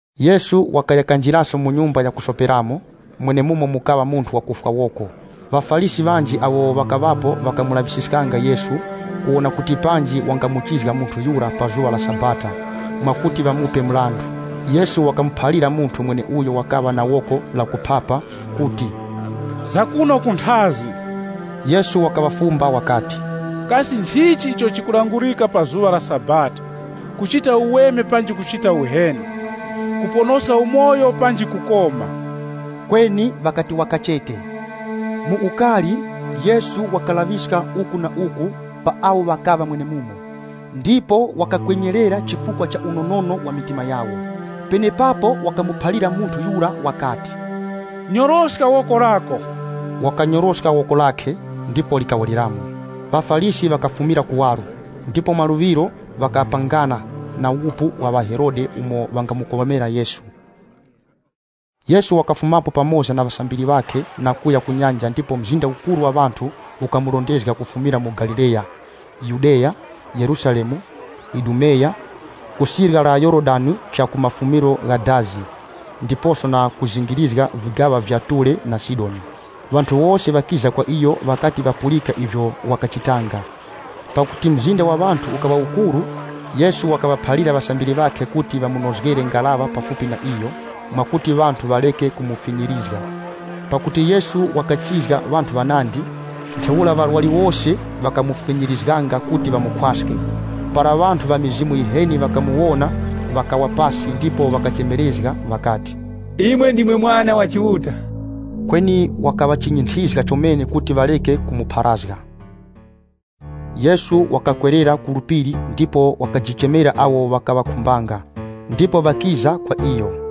Yesu wakaya kanjiraso mu nyumba ya kusoperamo, mwenemumo mukaŵa munthu wakufwa woko. ŴaFarisi ŵanji awo ŵakaŵapo ŵakamulaŵisiskanga Yesu, kuwona kuti panji wangamuchizga munthu yura pa zuŵa la Sabata mwakuti ŵamupe mrandu. Yesu wakamuphalira munthu mweneuyo wakaŵa na woko la kuphapa kuti, “Zakuno kunthazi.” Yesu wakaŵafumba wakati, “Kasi nchichi icho chikulangurika pa zuŵa la Sabata? Kuchita uweme panji kuchita uheni? Kuponoska umoyo panji kukoma?” Kweni ŵakati waka chete. Mu ukari, Yesu wakalaŵiska uku na uku pa awo ŵakaŵa mwenemumo, ndipo wakakwenyerera chifukwa cha unonono wa mitima yawo. Penepapo wakamuphalira munthu yura wakati, “Nyoroska woko lako.” Wakanyoroska woko lakhe, ndipo likawereramo. ŴaFarisi ŵakafumira kuwaro, ndipo maluŵiro ŵakapangana na wupu wa ŵaHerode umo ŵangamukomera Yesu. Yesu wakafumapo pamoza na ŵasambiri ŵakhe na kuya ku nyanja ndipo mzinda ukuru wa ŵanthu ukamurondezga kufumira mu Galileya. Kufumaso ku Yudeya, Yerusalemu na Idumeya, ku sirya linyakhe la mronga wa Yorodani, ndiposo na kuzingirizga vigaŵa vya Ture na Sidoni, ŵanthu ŵanandi ŵakiza kwa iyo ŵakati ŵakapulika vyose ivyo wakachitanga. Pakuti mzinda wa ŵanthu ukaŵa ukuru, Yesu wakaŵaphalira ŵasambiri ŵakhe kuti ŵamunozgere ngaraŵa pafupi na iyo, mwakuti ŵanthu ŵareke kumufinyirizga. Pakuti Yesu wakachizga ŵanthu ŵanandi, ntheura ŵarwari wose ŵakamufinyirizganga kuti ŵamukhwaske. Para ŵanthu ŵa mizimu yiheni ŵakamuwona, ŵakawa pasi ndipo ŵakachemerezga ŵakati, “Imwe ndimwe Mwana wa Chiuta!” Kweni wakaŵachinyinthizga chomene kuti ŵareke kumupharazga. Yesu wakakwerera ku phiri ndipo wakajichemera awo wakaŵakhumbanga, ndipo ŵakiza kwa iyo.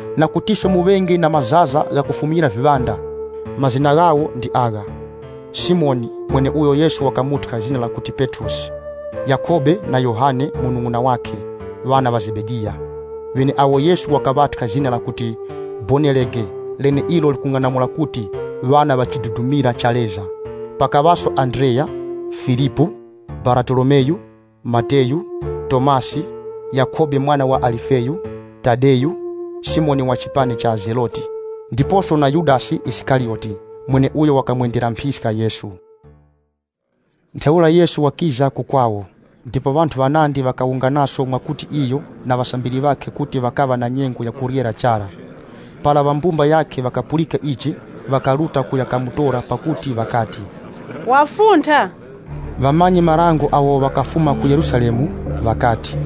na kutiso muŵenge na mazaza gha kufumyira viŵanda.” Mazina ghawo ndi agha: Simoni (mweneuyo Yesu wakamuthya zina lakuti Petrosi) Yakhobe na Yohane munung'una wakhe, ŵana ŵa Zebediya, (ŵeneawo Yesu wakaŵathya zina lakuti Bowanerege leneilo likung'anamula kuti, “Ŵana ŵa chidudumira cha Leza.”) Pakaŵaso Andreya, Filipu, Baratolomeyu, Mateyu, Tomasi, Yakhobe mwana wa Alifeyu, Tadeyu, Simoni wa chipani cha Zeloti. Ndiposo na Yudasi Isikariyoti, mweneuyo wakamwendera mphiska Yesu. Ntheura Yesu wakiza ku kwawo, ndipo ŵanthu ŵanandi ŵakawunganaso mwakuti iyo na ŵasambiri ŵakhe kuti ŵakaŵa na nyengo ya kuryera chara. Para ŵa mbumba yakhe ŵakapulika ichi, ŵakaruta kuya kamutora pakuti ŵakati, “Wafuntha.” Ŵamanyi-marango awo ŵakafuma ku Yerusalemu ŵakati,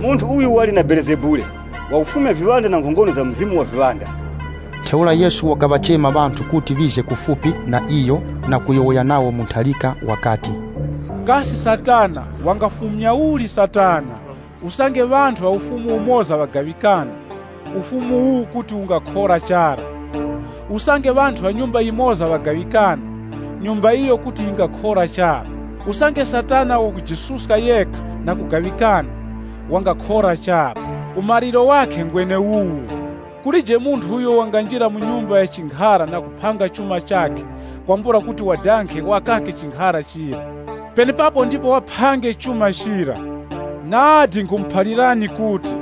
“Munthu uyu wali na Belezebule! Wakufumya viŵanda na nkhongono za mukuru wa viŵanda.” Ntheura Yesu wakaŵachema ŵanthu kuti ŵize kufupi na iyo na kuyowoya nawo mu ntharika wakati, Kasi Satana wangafumya uli Satana? Usange ŵanthu ŵa ufumu umoza ŵagaŵikana, ufumu uwu kuti ungakhora chara. Usange ŵanthu ŵa nyumba yimoza ŵagaŵikana, nyumba iyo kuti yingakhora chara. Usange Satana wakujisuska yekha na kugaŵikana, wangakhora chara. Umaliro wakhe ngweneuwu. “Kulije munthu uyo wanganjira mu nyumba ya chinkhara na kuphanga chuma chakhe kwambula kuti wadange wakake chinkhara chira. Penepapo ndipo waphange chuma chira. “Nadi nkhumuphalirani kuti,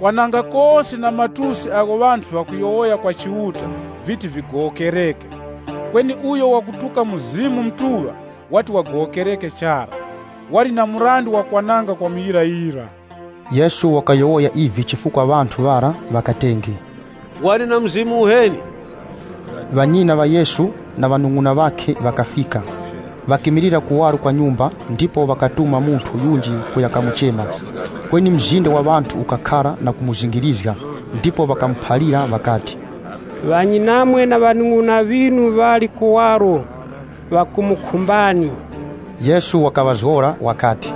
kwananga kose na matusi agho ŵanthu ŵakuyowoya kwa Chiuta viti vigowokereke. Kweni uyo wakutuka Mzimu Mutuŵa wati wagowokereke chara. Wali na mrandu wa kwananga kwa muyirayira.” (Yesu wakayowoya ivi chifukwa ŵanthu ŵara ŵakatenge, “Wali na mzimu uheni.”) Ŵanyina ŵa Yesu na ŵanung'una ŵakhe ŵakafika. Ŵakimilira kuwaro kwa nyumba, ndipo ŵakatuma munthu yunji kuya kamuchema. Kweni mzinda wa ŵanthu ukakhara na kumuzingirizga, ndipo ŵakamuphalira ŵakati, “Ŵanyinamwe na ŵanung'una ŵinu ŵali kuwaro ŵakumukhumbani.” Yesu wakaŵazgora wakati,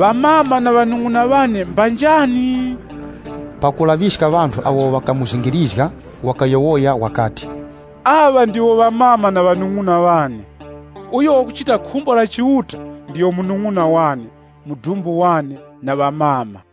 “Amama na ŵanung'una ŵane mbanjani?” Pakulaŵiska ŵanthu awo ŵakamuzingirizga wakayowoya wakati, “Aŵa ndiwo amama na ŵanung'una ŵane! Uyo wakuchita khumbo la Chiuta ndiyo munung'una wane, mudumbu wane, na amama.”